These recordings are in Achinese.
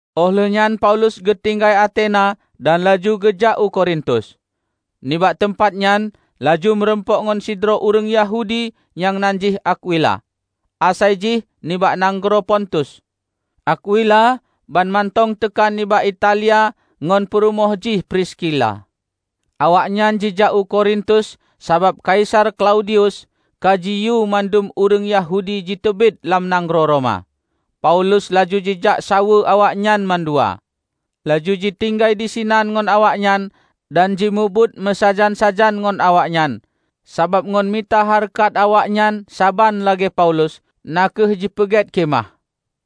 Óh lheuehnyan Paulus geutinggai Atena dan laju geujak u Korintus. Nibak teumpat nyan laju meurumpok ngon sidroe ureuëng Yahudi nyang nan jih Akwila; asai jih nibak nanggroe Pontus. Akwila banmantong teuka nibak Italia ngon peurumoh jih Priskila. Awaknyan jijak u Korintus sabab Kaisar Klaudius ka jiyue mandum ureuëng Yahudi jiteubiet lam nanggroe Roma. Paulus laju jijak saweue awaknyan mandua, laju jitinggai disinan ngon awaknyan dan jimubuet meusajan-sajan ngon awaknyan, sabab ngon mita hareukat awaknyan saban lagée Paulus, na kheueh jipeugét khimah.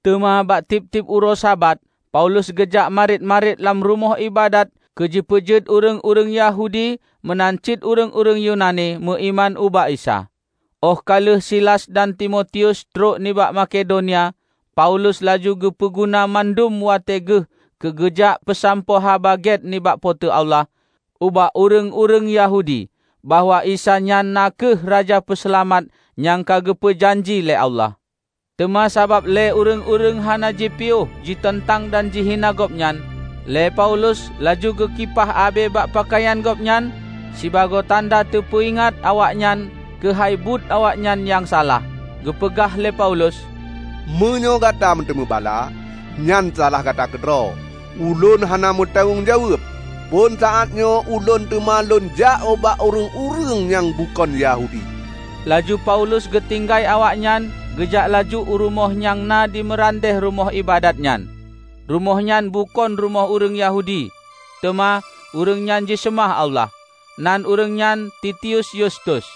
Teuma bak tieb-tieb uroe Sabat, Paulus geujak marit-marit lam rumoh iébadat keu jipeujeuet ureuëng-ureuëng Yahudi meunan cit ureuëng-ureuëng Yunani, meuiman ubak Isa. Óh ka lheueh Silas dan Timotius trok nibak Makedonia, Paulus laju geupeu guna mandum watée geuh keu geujak peusampoe haba gét nibak Po teu Allah ubak ureuëng-ureuëng Yahudi bahwa Isa nyan na kheueh Raja Peuseulamat nyang ka geupeu janji lé Allah. Teuma sabab lé ureuëng-ureuëng hana jipiôh jiteuntang dan jihina gobnyan, lé Paulus laju geukipah abée bak peukayan gobnyan sibagoe tanda teupeuingat awaknyan keuhai buet awaknyan nyang salah. Geupeugah lé Paulus, "Meunyoe gata meuteumé bala, nyan salah gata keudroe! Ulôn hana meutanggong jaweueb! Phon saátnyoe ulôn teuma lôn jak ubak ureuëng-ureuëng nyang bukon Yahudi." Laju Paulus geutinggai awaknyan geujak laju u rumoh nyang na di meurandeh rumoh iébadat nyan. Rumoh nyan bukon rumoh ureuëng Yahudi, teuma ureuëng nyan jiseumah Allah. Nan ureuëng nyan Titius Yustus.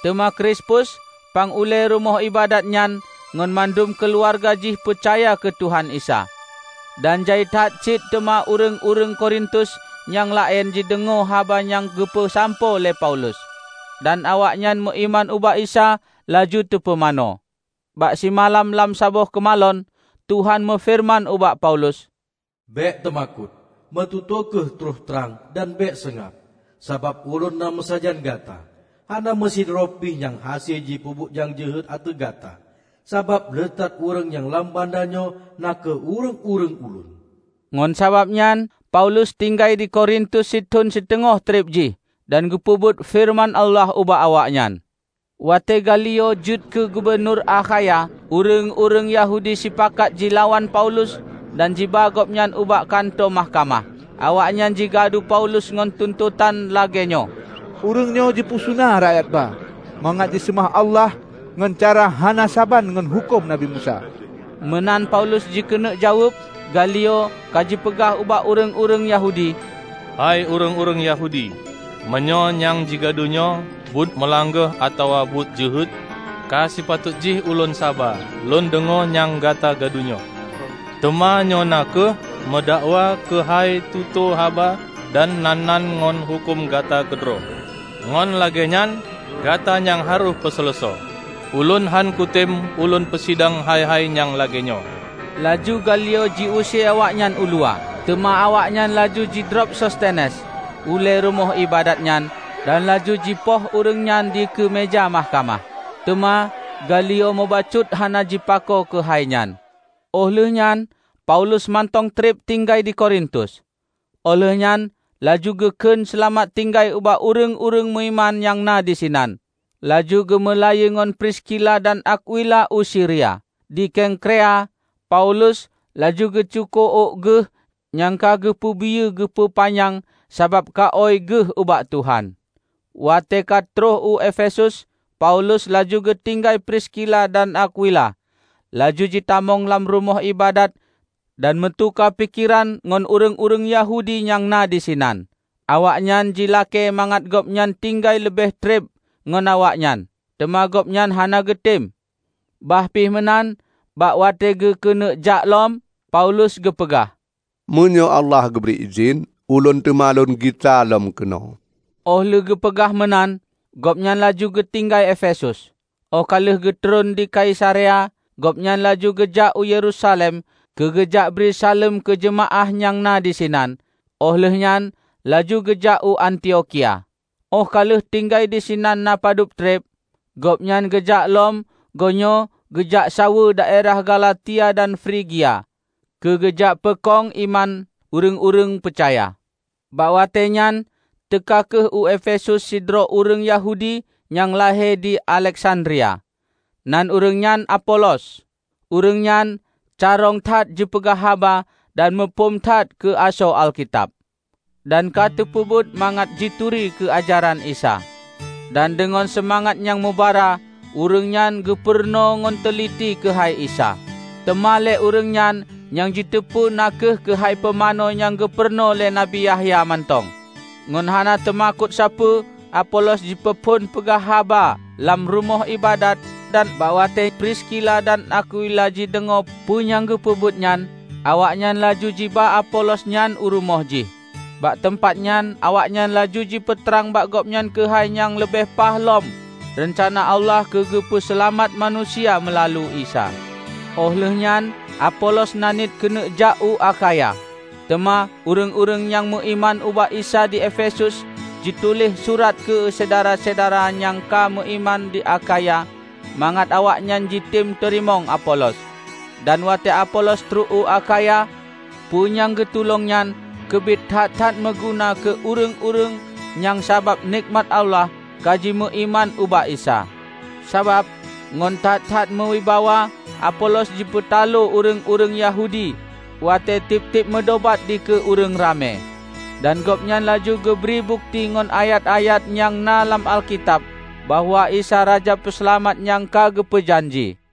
Teuma Krispus, pang ulée rumoh iébadat nyan ngon mandum keuluwarga jih peucaya keu Tuhan Isa. Dan jai that cit teuma ureuëng-ureuëng Korintus nyang laén jideungoe haba nyang geupeusampoe lé Paulus, dan awaknyan meuiman ubak Isa laju teupumanö. Bak simalam lam saboh keumalon, Tuhan meufeureuman ubak Paulus, "Bék teumakot, meututoe kheueh troh trang dan bék seungab. Sabab Ulôn na meusajan gata. Hana meusidroe pih nyang hase jipeubuet nyang jeuhet ateueh gata, sabab le that ureuëng lam bandanyoe na kheueh ureuëng-ureuëng Ulôn." Ngon sabab nyan Paulus tinggai di Korintus sithon siteungoh treb jih dan geupeubeuet feureuman Allah ubak awaknyan. Watée Galio jeuet keu gubunur Akhaya, ureuëng-ureuëng Yahudi sipakat jilawan Paulus dan jiba gobnyan ubak kantô mahkamah. Awaknyan jigadu Paulus ngon tuntotan lagée nyoe, "Ureuëng nyoe jipeusuna rakyat ba mangat jiseumah Allah ngon cara hana saban ngon huköm Nabi Musa!" Meunan Paulus jikeuneuk jaweueb, Galio ka jipeugah ubak ureuëng-ureuëng Yahudi, "Hai ureuëng-ureuëng Yahudi! Meunyoe nyang jigadunyoe buet meulanggeh atawa buet jeuhet, ka sipatot jih ulôn saba lôn deungoe nyang gata gadu nyoe. Teuma nyoe na kheueh meudakwa keuhai tutoe haba dan nan-nan ngon huköm gata keudroe! Ngon lagée nyan gata nyang harôh peuseuleusoe. Ulôn hán kutem ulôn peusidang hai-hai nyang lagée nyoe!" Laju Galio jiuse awaknyan uluwa. Teuma awaknyan laju jidrob Sostenes, ulée rumoh iébadat nyan, dan laju jipoh ureuëng nyan dikeue meuja mahkamah. Teuma Galio mubacut hana jipako keuhai nyan. Óh lheueh nyan Paulus mantong treb tinggai di Korintus. Óh lheueh nyan laju geu kheun seulamat tinggai ubak ureuëng-ureuëng meuiman nyang na disinan, laju geumeulayeue ngon Priskila dan Akwila u Siria. Di Kengkrea, Paulus laju geucuko ôk geuh nyang ka geupeubiyeu geupeupanyang sabab kaôy geuh ubak Tuhan. Watée ka trok u Efesus, Paulus laju geutinggai Priskila dan Akwila, laju jitamong lam rumoh iébadat dan meutuka pikeran ngon ureuëng-ureuëng Yahudi nyang na disinan. Awaknyan jilakée mangat gobnyan tinggai leubeh treb ngon awaknyan, teuma gobnyan hana geutem. Bah pih meunan, bak watée geukeuneuk jak lom, Paulus geupeugah, "Meunyoe Allah geubri idhin, ulôn teuma lôn gisa lom keunoe." Óh lheueh geupeugah meunan, gobnyan laju geutinggai Efesus. Óh ka lheueh geutreun di Kaisarea, gobnyan laju geujak u Yerusalem keu geujakbri saleuem keu jeumaáh nyang na disinan, óh lheueh nyan laju geujak u Antiokhia. Óh ka lheueh tinggai disinan na padub treb, gobnyan geujak lom goenyoe geujak saweue daerah Galatia dan Frigia keu geujak peukong iman ureuëng-ureuëng peucaya. Bak watée nyan, teuka kheueh u Efesus sidroe ureuëng Yahudi nyang lahé di Aleksandria, nan ureuëng nyan Apolos. Ureuëng nyan carông that jipeugah haba dan muphom that keu asoe Alkitab, dan ka teupeubeuet mangat jituri keu ajaran Isa. Dan deungon seumangat nyang mubara ureuëng nyan geupurunoe ngon teuliti keuhai Isa, teuma lé ureuëng nyan nyang jiteupeu na kheueh keuhai pumanö nyang geupurunoe lé Nabi Yahya mantong. Ngon hana teumakot sapeue Apolos jipeuphon peugah haba lam rumoh iébadat dan bak watée Priskila dan Akwila jideungoe peu nyang geupeubeuet nyan, awaknyan laju jiba Apolos nyan u rumoh jih. Bak teumpat nyan awaknyan laju jipeutrang bak gobnyan keuhai nyang leubeh paih lom reuncana Allah keu geupeu seulamat manusia meulalu Isa. Óh lheueh nyan Apolos na niet keuneuk jak u Akhaya. Teuma ureuëng-ureuëng nyang meuiman ubak Isa di Efesus jituléh surat keu syedara-syedara nyang ka meuiman di Akhaya mangat awaknyan jitem teurimong Apolos. Dan watée Apolos trok u Akhaya, peue nyang geutulông nyan keubiet that-that meuguna keu ureuëng-ureuëng nyang sabab nekmat Allah ka jimeuiman ubak Isa. Sabab, ngon that-that meuwibawa, Apolos jipeutaloe ureuëng-ureuëng Yahudi watée tieb-tieb meudobat dikeue ureuëng ramé. Dan gobnyan laju geubri bukeuti ngon ayat-ayat nyang na lam Alkitab bahwa Isa Raja Peuseulamat nyang ka geupeu janji.